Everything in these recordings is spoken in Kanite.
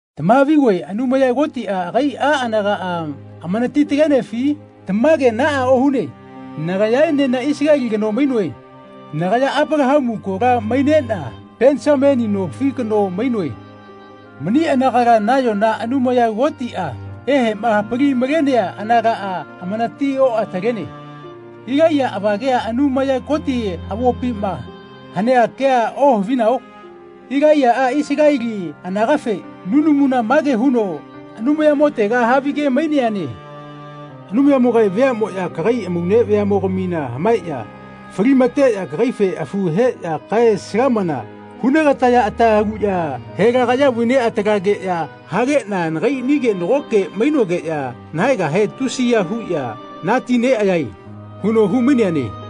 Tamahavigoe Anumaya Kotiꞌa agaiꞌa anagaꞌa amanati-talenefi? Tamage naꞌa ohune. Nagayaenena Isaleli kano mainoe. Nagaya Apalahamu kola maineꞌna Penisamini nofi kano mainoe. Mani anagala nayona Anumaya Kotiꞌa eheꞌma hapali-malenea anagaꞌa amanati-oꞌatalene. Ilaiya avagea Anumaya Koti avopima hanea kea ohavinao? Ilaiyaꞌa Isaleli anagafe nunamuna mage huno Anumayamotega havige-maineane. “Anumayamogae veaꞌmoꞌya kagai amaune veaꞌmogamina hamaeꞌya falimateꞌya kagaife afu heꞌya kae-salamana hunegataya ata haluꞌya helagaꞌya vaineꞌatalageꞌya hageꞌna nagaiꞌnige nagoke mainogeꞌya nahaegahe tusiya huꞌya natineꞌayae.” huno humaineane.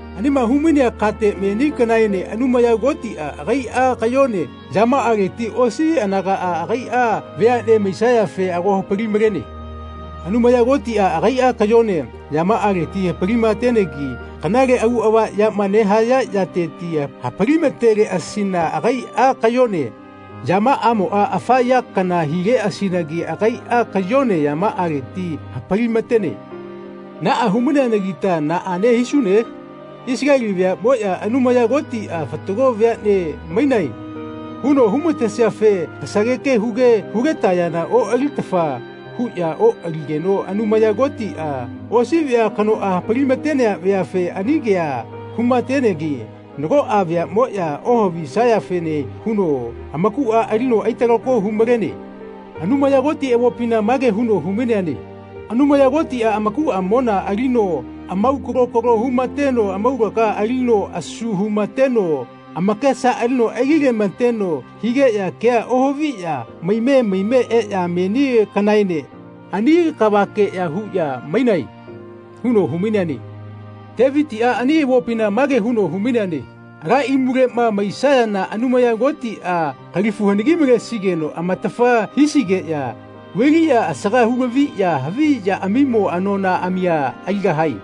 Anima humainea kate meni kanaene Anumaya Kotiꞌa agaiꞌa kayone yamaꞌaleti osi anagaꞌa agaiꞌa veaꞌne maisayafe ago hapali-malene. Anumaya Kotiꞌa agaiꞌa kayone yamaꞌaleti hapalimatenegi kanale auꞌava yama nehaya yateti hapalimateleꞌasina agaiꞌa kayone yamaꞌamoꞌa afa ya kana hileꞌasinagi agaiꞌa kayone yamaꞌaleti hapalimatene. Naꞌa humaineanagita naꞌane hisune? Isaleli veaꞌmoꞌya Anumaya Kotiꞌa “Fatago veaꞌne mainae.” huno humatesiafe kasageke huge hugetayana oꞌalitafa huꞌya oꞌaligeno Anumaya Kotiꞌa osi vea kanoꞌa hapalimatenea veafe ani kea humatenegi nagoꞌa veaꞌmoꞌya ohavisayafene huno amakuꞌa alino aitalako humalene. Anumaya Koti avopina mage huno humaineane “Anumaya Kotiꞌa amakuꞌamona alino amaukalo kalo humateno amaulaga alino asu humateno amakesa alino aililemateno higeꞌya kea ohaviꞌya maime maime eꞌya meni kanaene ani kavakeꞌya huꞌya mainae.” huno humaineane. Tevitiꞌa ani avopina mage huno humaineane “Ala imuleꞌma maisayana Anumaya Kotiꞌa kalifu hanagi-malesigeno amatafa hisigeꞌya vailiꞌya asaga hulaviꞌya havi yaꞌamimo anonaꞌamia aligahae.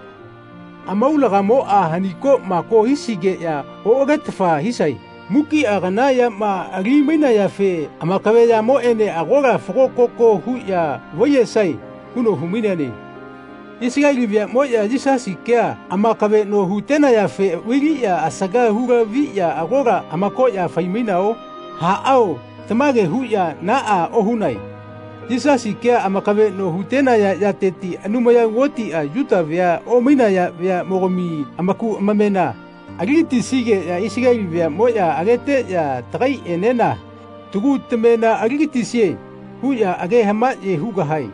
Amaulagamoꞌa hanikoꞌmako hisigeꞌya oꞌagetafa hisae. Mukiꞌa kana yama alimainayafe amakaveꞌyamoꞌene agola fago-koko huꞌya vaiyesae.” huno humaineane. Isaleli veaꞌmoꞌya Yisasi kea amakaveꞌno hutenayafe vailiꞌya asaga hulaviꞌya agola amakoꞌya faimainao? Aꞌao tamage huꞌya naꞌa ohunae. Yisasi kea amakaveꞌno hutenaya yateti Anumaya Kotiꞌa Yuta vea omainaya veaꞌmogami amaku amamena aligatisigeꞌya Isaleli veaꞌmoꞌya ageteꞌya “Tagaiꞌenena tagu tamena alilatisie.” huꞌya age hamaꞌye hugahae.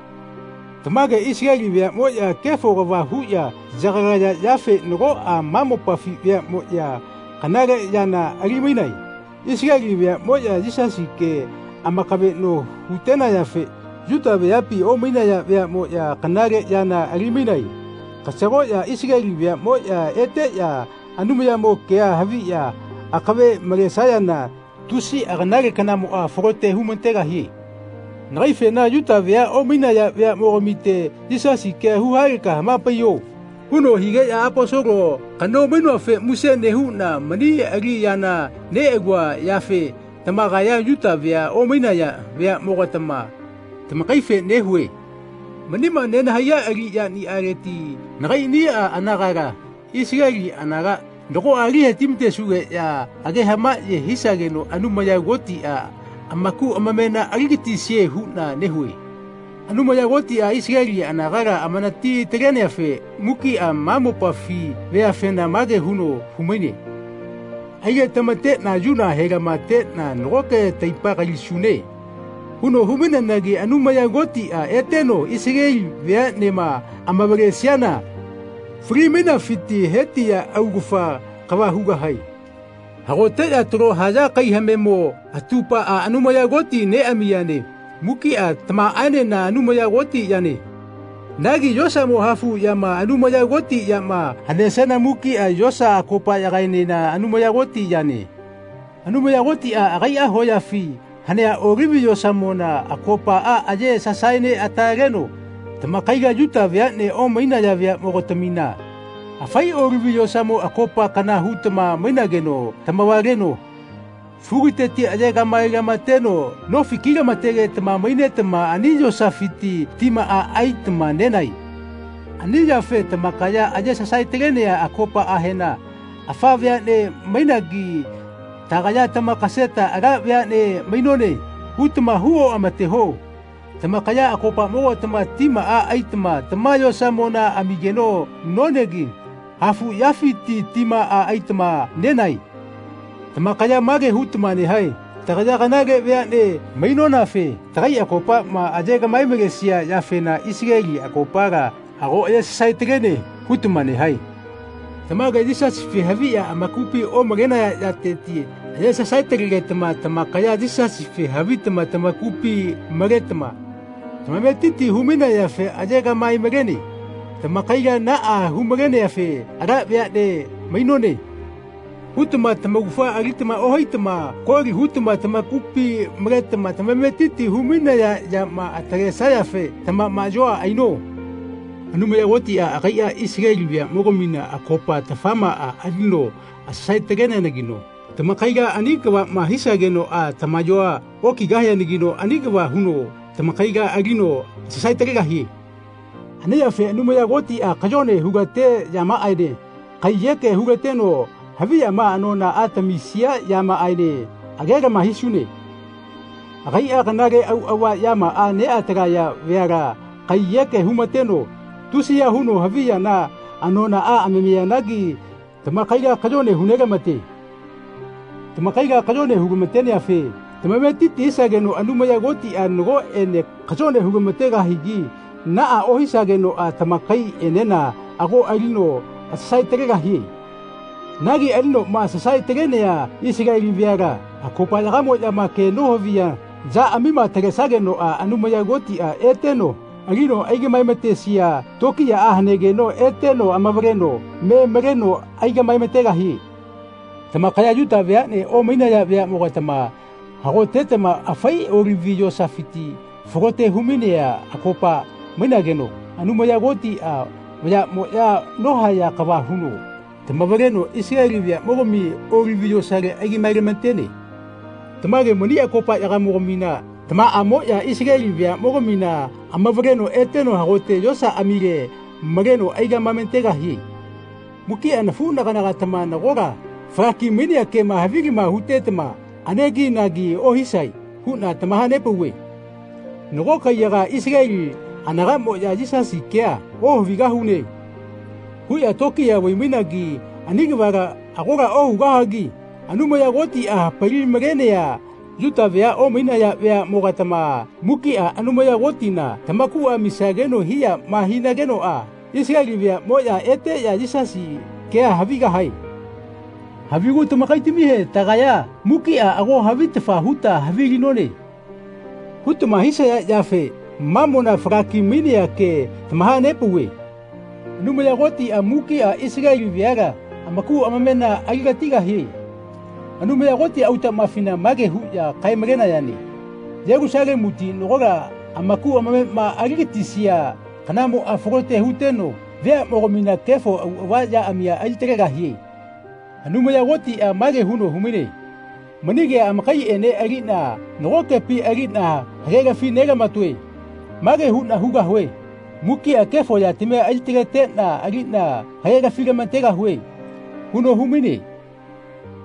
Tamage Isaleli veaꞌmoꞌya kefo kava huꞌya yagalaya yafe nagoꞌa ma mopafi veaꞌmoꞌya kanale yana alimainae. Isaleli veaꞌmoꞌya Yisasi kea amakaveꞌno hutenayafe Yuta veapi omainaya veaꞌmoꞌya kanale yana alimainae. Kasagoꞌya Isaleli veaꞌmoꞌya eteꞌya Anumayamo kea haviꞌya akave malesayana tusiꞌa kanale kanamoꞌa falote humategahie. Nagaifena “Yuta vea omainaya veaꞌmogamite Yisasi kea huhaleka hamapaiyo.” huno higeꞌna Aposolo kano mainoafe muse nehuꞌna mani aliꞌyana neꞌalua yafe tamakaya Yuta vea omainaya veaꞌmogatama tamakaife nehue. Manima nenahaiya aliꞌyaniꞌaleti nagaiꞌniꞌa anagala, Isaleli anaga, nagoꞌa alihetimatesugeꞌya age hamaꞌye hisageno Anumaya Kotiꞌa amaku amamena aligatisie huꞌna nehue. Anumaya Kotiꞌa Isaleli anagala amanati-taleneafe mukiꞌa ma mopafi veafena mage huno humaine “Aigetamateꞌna yuna helamateꞌna nagoke taipa kalisune.” huno humaineanagi Anumaya Kotiꞌa eteno Isaleli veaꞌnema amavalesiana fali-mainafiti hetiya augafa kava hugahae. Hagoteꞌya talo haya kai hamemo atupaꞌa Anumaya Koti neꞌamiyane mukiꞌa tamaꞌaenena Anumaya Koti yane. Nagi yosamo hafuꞌyama Anumaya Koti yama hanesiana mukiꞌa yosa akopaꞌyagae-nena Anumaya Koti yane. Anumaya Kotiꞌa agaiꞌa hoyafi hanea Olivi yosamona akopaꞌa aye sasaeneꞌataleno tamakaila Yuta veaꞌne omainaya veaꞌmogatamina, afai Olivi yosamo akopa kana hutama mainageno tamavaleno fukiteti aye kaꞌmaelamateteno nofi kilamategetama mainetama ani yosafiti timaꞌa aitama nenae. Ani yafe tamakaya aye sasaetalenea akopaꞌahena “Afa veaꞌne mainagi tagaya tamakaseta ala veaꞌne mainone.” hutama hu oꞌamateho. Tamakaya akopamogatama timaꞌa aitama tama yosamona amigeno nonegi hafuꞌyafiti timaꞌa aitama nenae. Tamakaya mage hutama nehae “Tagaya kanale veaꞌne mainonafe tagai akopaꞌma aye gaꞌmae-malesia yafena Isaleli akopala ago aye sasaetalene.” hutama nehae. Tamage Yisasife haviꞌya amakupi omalaya yateti aye sasae-talegetama tamakaya Yisasife havitama tamakupi maletama tamametiti humainayafe aye gaꞌmae-malene. Tamakaila naꞌa humaleneafe “Ala veaꞌne mainone.” hutama tamaugafa alitama ohaitama koli hutama tamakupi maletama tamametiti humainaya yama atalesayafe tamamaꞌyoa aino. Anumaya Kotiꞌa agaiꞌa Isaleli veaꞌmogamina akopa-tafamaꞌa alino asasae-taleneanagino tamakaila ani kavaꞌma hisagenoꞌa tamayoa okigahianagino ani kava huno tamakaila alino asasae-talegahie. Ani yafe Anumaya Kotiꞌa kayone hulate yamaꞌaene kaiyeke hulateno haviyama anonaꞌa tamisia yamaꞌaene agelama hisune. Agaiꞌa kanale auꞌava yamaꞌa neꞌatalaya veala kaiyeke humateno tusiya huno havi yana anonaꞌa amamiyanagi tamakaila kayone hunelamate. Tamakaila kayone hulamateneafe tamametiti hisageno Anumaya Kotiꞌa nagoꞌene kayone hulamategahigi naꞌa ohisagenoꞌa tamakaiꞌenena ago alino asasae-talegahie. Nagi alinoꞌma asasae-talenea Isaleli veala akopaꞌyagamoꞌyama ke nohavia yaꞌamima atalesagenoꞌa Anumaya Kotiꞌa eteno alino aigaꞌmaematesia tokiyaꞌa hanegeno eteno amavaleno me maleno aigaꞌmaemategahie. Tamakaya Yuta veaꞌne omainaya veaꞌmogatama hagotetama afai Olivi yosafiti falote humainea akopa mainageno Anumaya Kotiꞌa vayaꞌmoꞌya nohaya kava huno tamavaleno Isaleli veaꞌmogami Olivi yosale aigaꞌmaelamatene. Tamage mani akopaꞌyagamogamina tamaꞌamoꞌya Isaleli veaꞌmogamina amavaleno eteno hagote yosaꞌamile maleno aigaꞌmaemategahie. Mukiꞌa nafuꞌnaganagatama nagola falaki-mainea kema havilama hutetama aneginagi ohisae huꞌna tamahanepauve. Nago kaiyagaꞌa Isaleli anagaꞌmoꞌya “Yisasi kea ohavigahune.” huꞌya tokiya vaimainagi ani kavala agola ohugahagi Anumaya Kotiꞌa hapali-malenea Yuta vea omainaya veaꞌmogatama mukiꞌa Anumaya Kotina tamakuꞌa amisageno hiyaꞌma hinagenoꞌa Isaleli veaꞌmoꞌya eteꞌya Yisasi kea havigahae. Havigu tamakaitamihe “Tagaya mukiꞌa ago havitafa huta havilinone.” hutama hisaya yafe mamona falaki-mainea ke tamahanepauve. Anumaya Kotiꞌa mukiꞌa Isaleli veala amaku amamena aligatigahie. Anumaya Koti autamafina mage huꞌya kae-malenayane “Yelusalemuti nagola amaku amamema aligatisia kanamoꞌa falote huteno veaꞌmogamina kefo auꞌava yaꞌamia alitalegahie.” Anumaya Kotiꞌa mage huno humaine “Mani kea amakaiꞌene aliꞌna nagokepi aliꞌna hagelafi nelamatoe. Mage huꞌna hugahue mukiꞌa kefo yatamia alitaleteꞌna aliꞌna hagelafilamategahue.” huno humaine.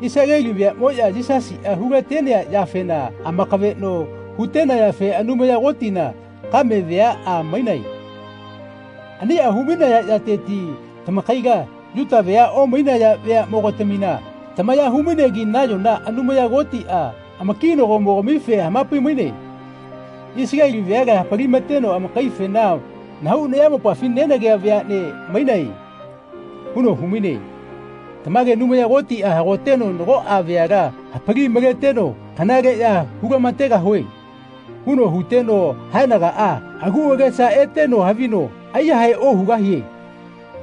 Isaleli veaꞌmoꞌya Yisasiꞌa hulatenea yafena amakaveꞌno hutenayafe Anumaya Kotina kame veaꞌa mainae. Aniꞌa humainaya yateti tamakaila Yuta vea omainaya veaꞌmogatamina tamaya humainegi nayona Anumaya Kotiꞌa amakinagomogamife hamapaimaine. Isaleli veala hapalimateno amakaifena “Nahau nayamopafi nenagea veaꞌne mainae.” huno humaine. Tamage Anumaya Kotiꞌa hagoteno nagoꞌa veala hapali-maleteno “Kanale ya hulamategahue.” huno huteno haenagaꞌa agu agesa eteno havino aiyahae ohugahie.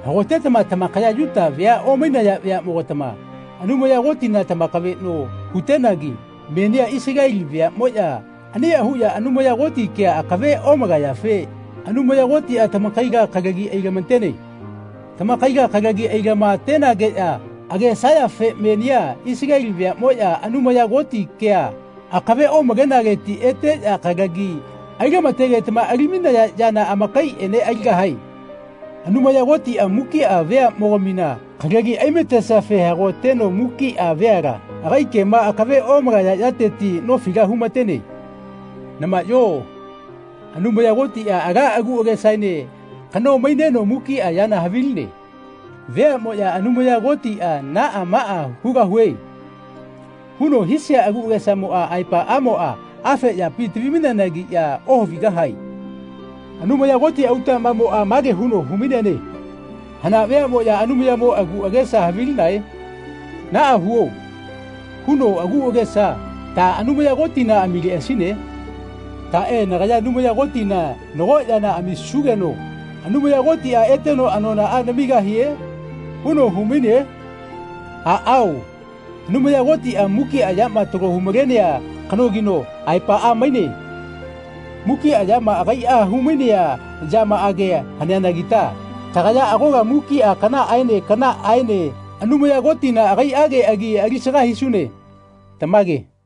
Hagotetama tamakaya Yuta vea omainaya veaꞌmogatama Anumaya Kotina tamakaveꞌno hutenagi menia Isaleli veaꞌmoꞌya aniꞌa huꞌya Anumaya Koti kea akave omalayafe Anumaya Kotiꞌa tamakaila kalagi ailamatene. Tamakaila kalagi ailamatenageꞌya agesayafe menia Isaleli veaꞌmoꞌya Anumaya Koti kea akave omalenaleti eteꞌya kalagi ailamategetama alimainaya yana amakaiꞌene aligahae. Anumaya Kotiꞌa mukiꞌa veaꞌmogamina kalagi aimatesiafe hagoteno mukiꞌa veala agai kema akave omalaya yateti nofila humatene. Namaꞌyo Anumaya Kotiꞌa ala agu agesaene kano maineno mukiꞌa yana haviline. Veaꞌmoꞌya Anumaya Kotiꞌa “Naꞌa maꞌa hugahue.” huno hisia agu agesamo aepaꞌamoꞌa afe yapi tavimaineanagiꞌya ohavigahae. Anumaya Koti autaꞌmamoꞌa mage huno humaineane “Hana veaꞌmoꞌya Anumayamo agu agesa havilinae? ‘Naꞌa huo.’ huno agu agesa ta Anumaya Kotina amileꞌasine? Taꞌe ‘Nagaya Anumaya Kotina nago yana amisugeno Anumaya Kotiꞌa eteno anonaꞌa namigahie?’ huno humaine?” Aꞌao Anumaya Kotiꞌa mukiꞌa yama talo humalenea kanogino aepaꞌa maine. Mukiꞌa yana agaiꞌa haumainea yamaꞌage haneanagita tagaya agola mukiꞌa kanaꞌaene kanaꞌaene Anumaya Kotina agaiꞌage agi alisaga hisune. Tamage.